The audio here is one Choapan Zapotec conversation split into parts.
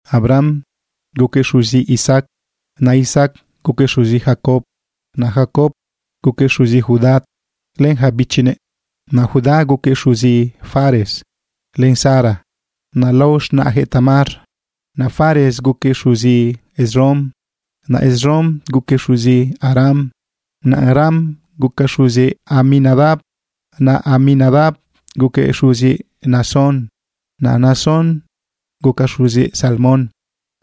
Abraham guquëꞌ xuzi Isaac, naꞌ Isaac guquëꞌ xuzi Jacob, naꞌ Jacob guquëꞌ xuzi Judá len ja bichinëꞌ. Naꞌ Judá guquëꞌ xuzi Fares len Zara, naꞌ lao z̃naꞌjëꞌ Tamar. Naꞌ Fares guquëꞌ xuzi Esrom, naꞌ Esrom guquëꞌ xuzi Aram. Naꞌ Aram guquëꞌ xuzi Aminadab, naꞌ Aminadab guquëꞌ xuzi Naasón, naꞌ Naasón guquëꞌ xuzi Salmón.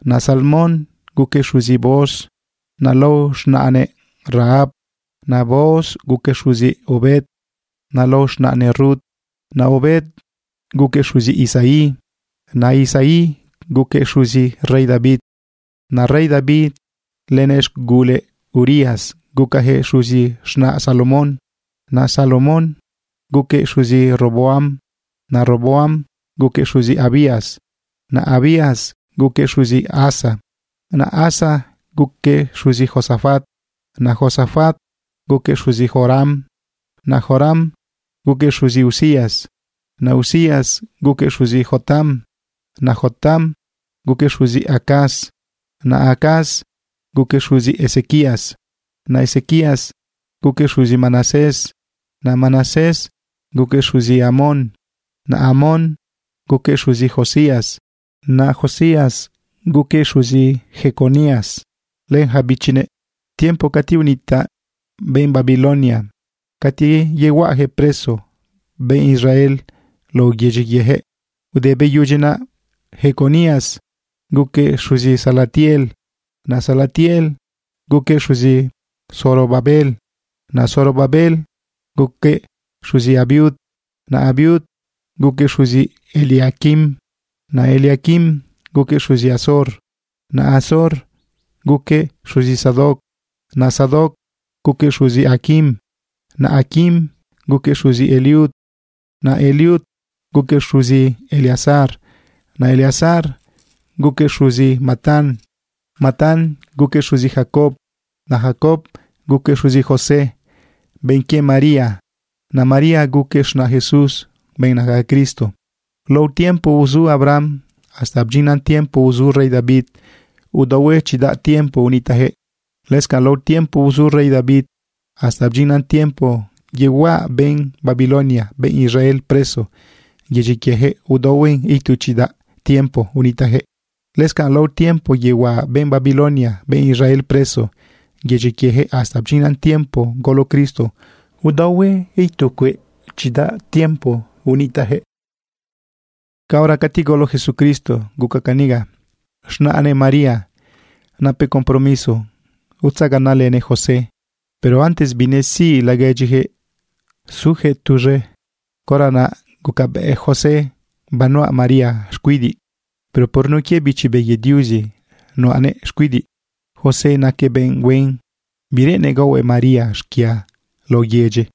Naꞌ Salmón guquëꞌ xuzi Booz, naꞌ lao z̃naꞌnëꞌ Rahab. Naꞌ Booz guquëꞌ xuzi Obed, naꞌ lao z̃naꞌnëꞌ Rut. Naꞌ Obed guquëꞌ xuzi Isaí. Naꞌ Isaí guquëꞌ xuzi rey David, naꞌ rey David lënëꞌ z̃gula Urías gucajëꞌ xuzi z̃naꞌ Salomón. Naꞌ Salomón guquëꞌ xuzi Roboam, naꞌ Roboam guquëꞌ xuzi Abías, naꞌ Abías guquëꞌ xuzi Asa. Naꞌ Asa guquëꞌ xuzi Josafat, naꞌ Josafat guquëꞌ xuzi Joram, naꞌ Joram guquëꞌ xuzi Uzías. Naꞌ Uzías guquëꞌ xuzi Jotam, naꞌ Jotam guquëꞌ xuzi Acaz, naꞌ Acaz guquëꞌ xuzi Ezequías. Naꞌ Ezequías guquëꞌ xuzi Manasés, naꞌ Manasés guquëꞌ xuzi Amón, naꞌ Amón guquëꞌ xuzi Josías. Naꞌ Josías guquëꞌ xuzi Jeconías len ja bichinëꞌ tiempo cati unitaꞌ benꞌ Babilonia cati yahuaꞌajëꞌ preso benꞌ Israel lao yedyi quiejëꞌ. Te beyudyi naꞌ, Jeconías guquëꞌ xuzi Salatiel, naꞌ Salatiel guquëꞌ xuzi Zorobabel. Naꞌ Zorobabel guquëꞌ xuzi Abiud, naꞌ Abiud guquëꞌ xuzi Eliaquim, naꞌ Eliaquim guquëꞌ xuzi Azor. Naꞌ Azor guquëꞌ xuzi Sadoc, naꞌ Sadoc guquëꞌ xuzi Aquim, naꞌ Aquim guquëꞌ xuzi Eliud. Naꞌ Eliud guquëꞌ xuzi Eleazar, naꞌ Eleazar guquëꞌ xuzi Matán, naꞌ Matán guquëꞌ xuzi Jacob. Naꞌ Jacob guquëꞌ xuzi José, benꞌ quie María, naꞌ María guquëꞌ z̃naꞌ Jesús, benꞌ naca Cristo. Lao tiempo uzu Abraham hasta bdyinnan tiempo uzu rey David, udaohue chidaꞌ tiempo unitaꞌjëꞌ. Lëscanꞌ lao tiempo uzu rey David hasta bdyinnan tiempo yehuaꞌa benꞌ Babilonia benꞌ Israel preso yedyi quiejëꞌ, udaohue itu chidaꞌ tiempo unitaꞌjëꞌ. Lëscanꞌ lao tiempo yehuaꞌa benꞌ Babilonia benꞌ Israel preso yedyi quiejëꞌ hasta bdyinnan tiempo golo Cristo, udaohue itu cueꞌ chidaꞌ tiempo unitaꞌjëꞌ. Caora cati golo Jesucristo guca caniga: Z̃naꞌnëꞌ María napëꞌ compromiso utzaganaꞌlënëꞌ José. Pero antes binesiꞌ laguedyijëꞌ sujëꞌ tuz̃e, caora naꞌ gucabëꞌ José banuꞌa María xcuidiꞌ. Pero por nun quie Bichi Be quie Diuzi nuꞌanëꞌ xcuidiꞌ. José naquëꞌ benꞌ huen bireꞌennëꞌ gaohuëꞌ María xquia lao yedyi.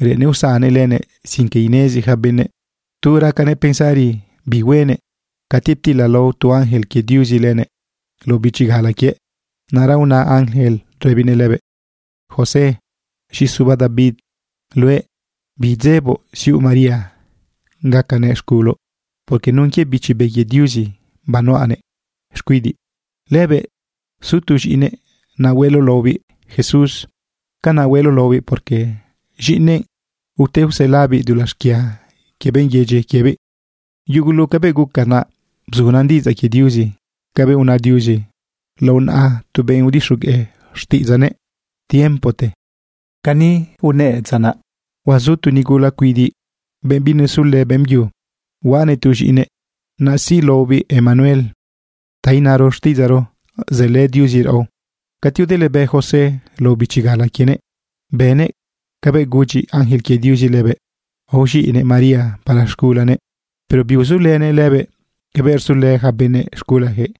Reꞌennëꞌ usannëꞌ lenëꞌ sin que inezi ja benëꞌ. Tu racanëꞌ pensari bi huenëꞌ, cati ptilalao tu ángel quie Diuzi lenëꞌ lao bichi gala quiëꞌ. Naꞌra una ángel rëbinëꞌ lëbëꞌ: ―José, z̃iꞌi suba David luëꞌ, bidzeboꞌ siuꞌ María gacanëꞌ z̃guloꞌ, porque nun quie Bichi Be quie Diuzi banuꞌanëꞌ xcuidiꞌ. Lëbëꞌ su tu z̃iꞌinëꞌ, naꞌ hueloꞌ laobiꞌ JESUS. Canaꞌ hueloꞌ laobiꞌ porque z̃iꞌinëꞌ ute uselabiꞌ dulaꞌ xquia quie benꞌ yedyi quiebiꞌ. Yugulu cabëꞌ guca naꞌ, bzunan diꞌidzaꞌ quie Diuzi cabëꞌ una Diuzi lao naꞌa tu benꞌ udixogueꞌ xtiꞌidzaꞌnëꞌ tiempote. Cani unëꞌ dza naꞌ: Huazu tu nigula cuidiꞌ, benꞌ binesulë beꞌmbyu, huaꞌanëꞌ tu z̃iꞌinëꞌ. Naꞌ siꞌ laobiꞌ Emanuel. Ta inaro xtiꞌidzaꞌro: Zëlë Diuzi raꞌo. Cati udëlebë José lao bichi gala quienëꞌ, bënëꞌ cabëꞌ gudyi ángel quie Diuzi lëbëꞌ. Aoz̃iꞌnëꞌ María para z̃gulanëꞌ. Pero biuzulënëꞌ lëbëꞌ cabëꞌ rzulë ja benëꞌ z̃gulajëꞌ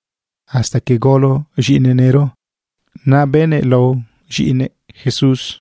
hasta que golo z̃iꞌinëꞌ nëro. Naꞌ bëꞌnëꞌ lao z̃iꞌinëꞌ JESUS.